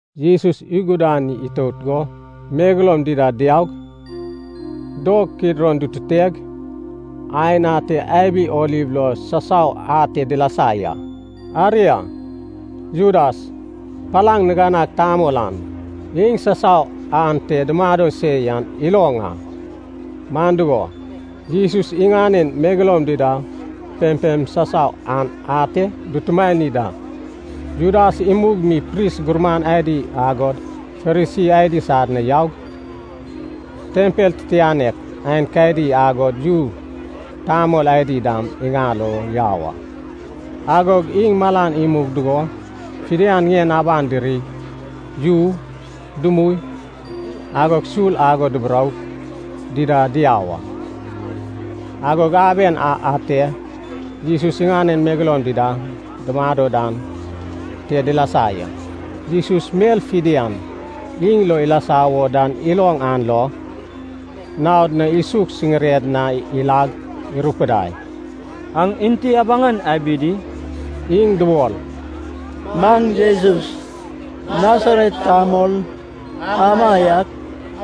Jesus igudani itout go megeloum dida diaug, dog Kidron dututeg, aen ate abi oliv lo sasau ate dilasa ya. Aria, Judas, palaŋ niganag tamol an, iŋ sasau ante dumado se yan iloŋ a. Man dugo, Jesus iŋanen megeloum dida pempem sasau an ate dutumani da. Judas imug mi pris gurman adi agod Farisi adi sad na yaug, tempel titianek aenkadi agod yu tamol adi dam iŋal o yau a. Agog iŋ malan imug dugo fidian ŋien aban dirig yu, dumui, agod sul ago duburoug dida diau a. Agog aben a ate Jesus iŋanen megeloum dida dumado dan te dilasa ya. Jesus mel fidian iŋ lo ilasa wo dan iloŋ an lo, naod na isuk siŋired na ilag irupudai, “Aŋ enti abaŋan abi di?” Iŋ dubol, “Maŋ Jesus, Nasaret tamol amaiak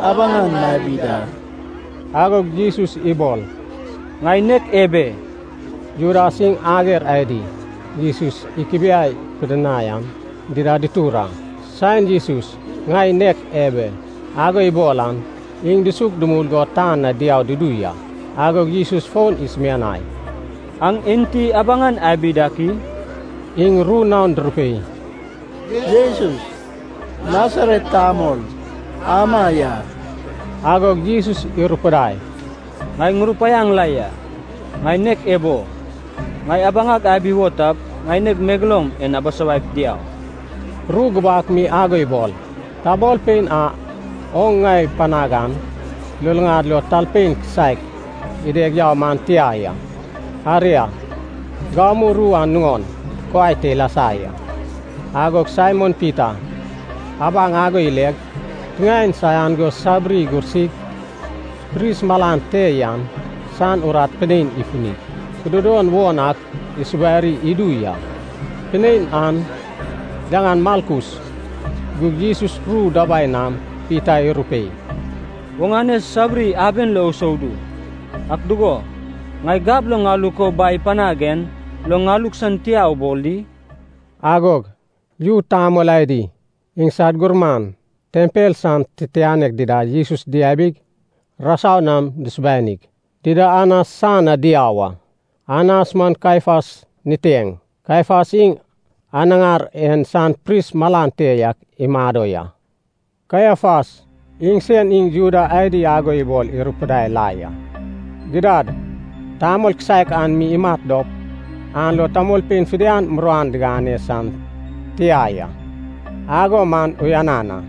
abaŋan mabi da.” Agog Jesus ibol, “Ŋai nek ebe.” Judas iŋ ager adi Jesus ikubiai pidinai an dida ditur a. Saen Jesus “ŋai nek ebe” ago ibol an, iŋ dusuk dumul go tan na diau dudu ya. Agog Jesus fon isumianai, “Aŋ enti abaŋan abi dak i?” Iŋ ru naon durupei, “Jesus, Nasaret tamol ama ya.” Agog Jesus irupudai, “Ŋai ŋurupaiaŋ la ya, ŋai nek ebo. Ŋai abaŋag abi wo tap, ŋaineg megeloum en abisawaip diau.” Ru gubak mi ago ibol, “Tamolpein a oŋ ŋai panag an luluŋad lo talpein kisaek ideg yau man tia ya.” Aria, gamu ru an nuŋon kuai te ilasa ya. Agog Saimon Pita abaŋ ago ileg, tiŋaen saian go sabiri igursig, pris malan te yan san urat pinein ifunig, kududon won ak isubari idu ya. Pinein an yaŋan Malkus. Gug Jesus ru dabai nam Pita irupei, “Oŋane sabiri aben lo usoudu. Ak dugo, ŋai gab lo ŋaluk o Bai ipanag en lo ŋaluk san tia ubol di?” Agog yu tamol adi, iŋsad gurman, tempel san titianek dida Jesus diabig, rasau nam dusubanig, dida Anas san na diau a. Anas man Kaiafas niteŋ. Kaiafas iŋ anaŋar en san pris malan te yak imado ya. Kaiafas iŋsen iŋ Juda adi ago ibol irupudai la ya, “Gidad, tamol kisaek an mi imat dop, an lo tamolpein fidian muruan diŋane san tia ya, ago man uyanan a.”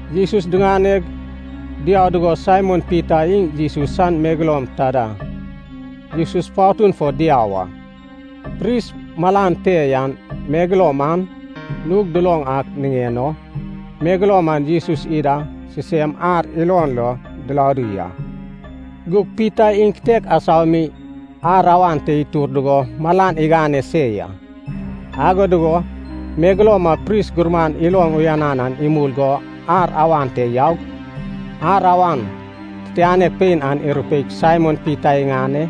Jesus diŋaneg diau dugo Saimon Pita iŋ Jesus san megeloum taida Jesus patun fo diau a. Pris malan te yan megeloum an nug duloŋ ak niŋen o megeloum an Jesus ida sisem ar ilon lo diladu ya. Gug Pita iŋ kitek asau mi ar awan te itur dugo malan igane se ya. Ago dugo megeloum a pris gurman iloŋ uyan an imul go ar awan te yaug, ar awan titianek pein an irupeip Saimon Pita iŋane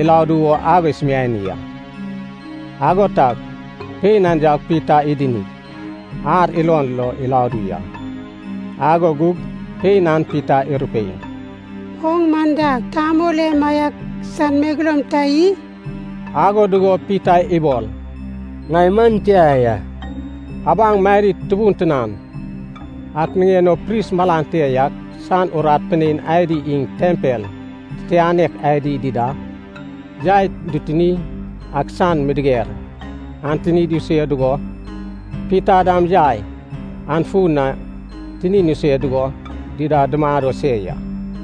iladu wo ago isumiani a. Ago tag pein an yaug Pita idinig, ar ilon lo iladu ya. Ago gug pein an Pita irupei, “Oŋ man dag tamol emaiak san megeloum ta i?” Ago dugo Pita ibol, “Ŋai man tia ya.” Abaŋ madid tubun tinan ak niŋen o pris malan te yak san urat pinein adi iŋ tempel titianek adi dida, yai dutuni ak san midiger an tinid isue dugo, Pita dam yai an fun na tinin isue dugo dida dumado se ya.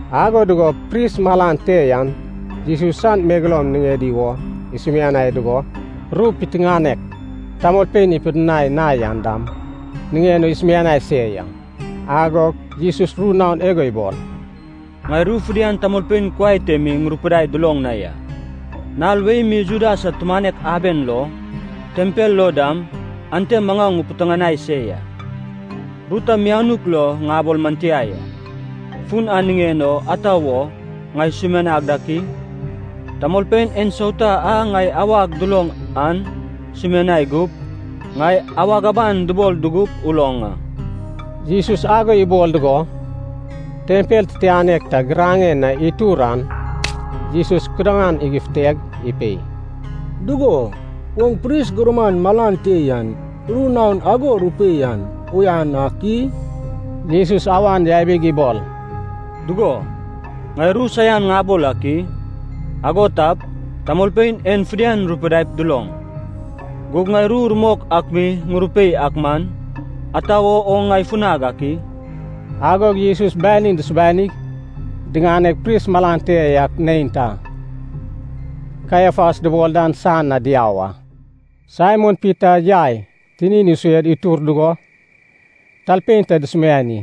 Ago dugo pris malan te yan Jesus san megeloum niŋedi wo isumiani dugo, ru piteŋanek tamolpein ipidinai na yan dam niŋen o isumiani se ya. Agog Jesus ru naon igo ibol, “Ŋai ru fidian tamolpein kuai te mi ŋurupidaig duloŋ na ya. Nal wei mi Juda sad tumanek aben lo, tempel lo dam, ante maŋau ŋupiteŋanai se ya. Ru ta mianuk lo ŋabol man tia ya. Fun an niŋen o ata wo ŋai sumianag dak i? Tamolpein ensauta a ŋai awag duloŋ an sumianai gup, ŋai awag aban dubol dugup uloŋ a.” Jesus ago ibol dugo, tempel titianek ta giraŋen na itur an Jesus kudaŋan igufuteg ipei, “Dugo, oŋ pris gurman malan te yan ru naon ago rupei an uyan ak i?” Jesus awan yabig ibol, “Dugo, ŋai ru saian ŋabol ak i? Ago tap, tamolpein en fidian rupidaip duloŋ. Gug ŋai ru rumok ak mi ŋurupei ak man, ata wo oŋ ŋai funag ak i?” Agog Jesus banin dusubanig, diŋaneg pris malan te yak neinta, Kaiafas dubol dan san na diau a. Saimon Pita yai tinin isued itur dugo, talpein ta dusumiani,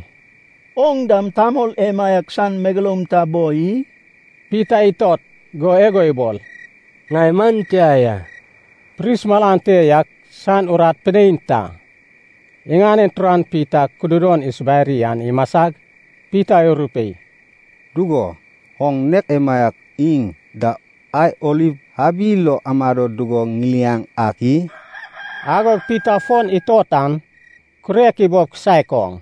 “Oŋ dam tamol emaiak san megeloum ta boi i?” Pita itot go igo ibol, “Ŋai man tia ya.” Pris malan te yak san urat pinein ta iŋanen turan Pita kududon isubari an imasag, Pita irupei, “Dugo, oŋ nek emaiak iŋ da ai oliv abi lo amado dugo ŋiliaŋ ak i?” Agog Pita fon itot an, kurek ibob kisaek oŋ.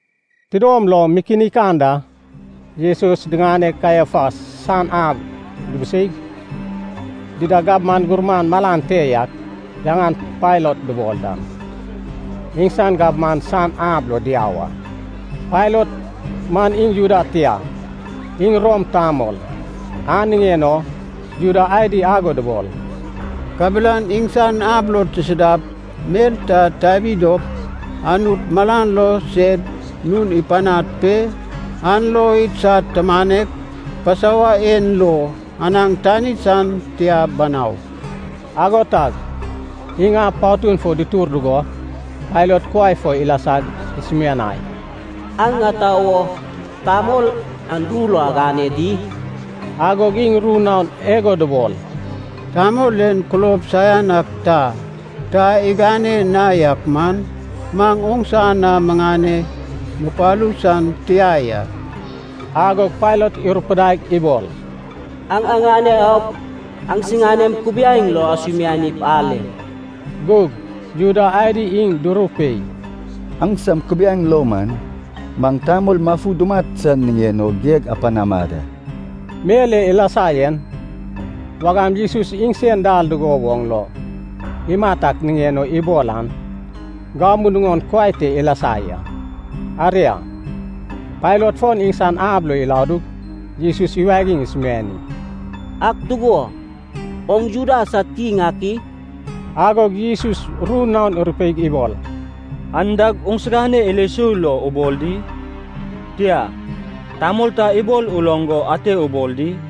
Tidom lom mikinik anda Jesus diŋaneg Kaiafas san ab dubuseig, dida gabman gurman malan te yak, yaŋan Pailat dubol dan, iŋsan gabman san ab lo diau a. Pailat man iŋ Juda tia, iŋ Rom tamol. An niŋen o Juda adi ago dubol, “Kabelan iŋsan ab lo tisidap mel ta tabi dop, Anut malan lo sed nun ipanad pe, an lo idsad tumanek Pasova en lo anaŋ tani san tia banau.” Ago tag iŋ ab patun fo dutur dugo, Pailat kuai fo ilasag, isumianai, “Aŋ ata wo tamol an ru lo agane di?” Agog iŋ ru naon igo dubol, “Tamol en kulob saian ak ta, ta igane na yak man, maŋ oŋsa na miŋane mupalu san tia ya.” Agog Pailat irupudaig ibol, “Aŋ aŋane aup, aŋsiganem kubiaeŋ lo asumianip ale.” Gug Juda adi iŋ durupei, “Aŋsam kubiaeŋ lo man, maŋ tamol mafu dumat san niŋen o geg apanama da.” Mel e ilasa yen, wagam Jesus iŋsen dal dugo woŋ lo imat ak niŋen o ibol an, gamu nuŋon kuai te ilasa ya. Aria, Pailat fon iŋsan ab lo iladug, Jesus iwagig isumiani, “Ak dugo, oŋ Juda sad kiŋ ak i?” Agog Jesus ru naon irupeig ibol, “An dag oŋsigane ilo sou lo ubol di? Tia, tamol ta ibol uloŋ go ate ubol di?”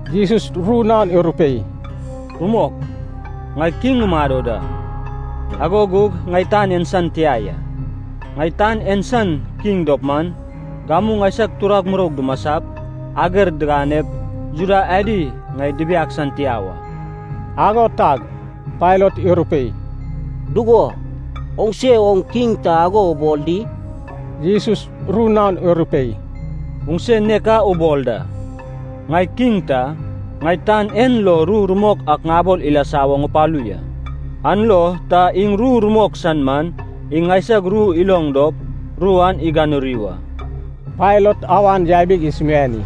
Jesus ru naon irupei, “Rumok, ŋai kiŋ ŋumado da, ago gug ŋai tan en san tia ya. Ŋai tan en san kiŋ dop man, gamu ŋaisag turag muroug dumasap, ager diganep, Juda adi ŋai dibiag san tia wa.” Ago tag Pailat irupei, “Dugo, oŋse oŋ kiŋ ta ago ubol di?” Jesus ru naon irupei, “Oŋse nek a ubol da. Ŋai kiŋ ta, ŋai tan en lo ru rumok ak ŋabol ilasa wo ŋupalu ya. An lo ta iŋ ru rumok san man, iŋ ŋaisag ru iloŋ dop ru an iganuri wa.” Pailat awan yabig isumiani,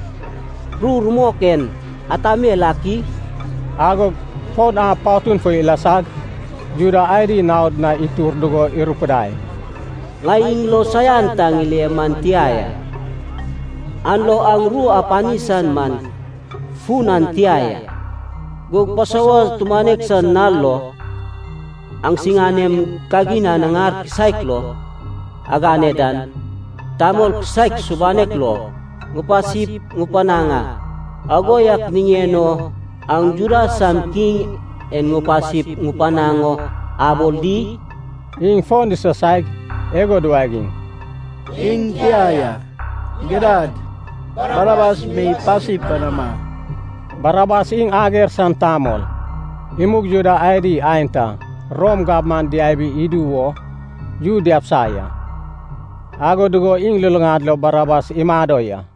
“Ru rumok en ata mel ak i?” Agog fon ab patun fo ilasag, Juda adi naod na itur dugo irupidai, “Ŋai iŋ lo saian ta ŋile man tia ya, an lo aŋ ru apani san man fun an tia ya. Gug Pasova tumanek san nal lo, aŋsiganem kagin anaŋar kisaek lo agane dan, tamol kisaek subanek lo ŋupasip ŋupanaŋ a. Ago yak niŋen o aŋ Juda sam kiŋ en ŋupasip ŋupanaŋ o abol di?” Iŋ fon disasaig igo duwagiŋ, “Iŋ tia ya, gidad Barabas mi pasi panama!” Barabas iŋ ager san tamol, imug Juda adi aenta Rom gabman diabi idu wo yu diabisa ya, ago dugo iŋ luluŋad lo Barabas imado ya.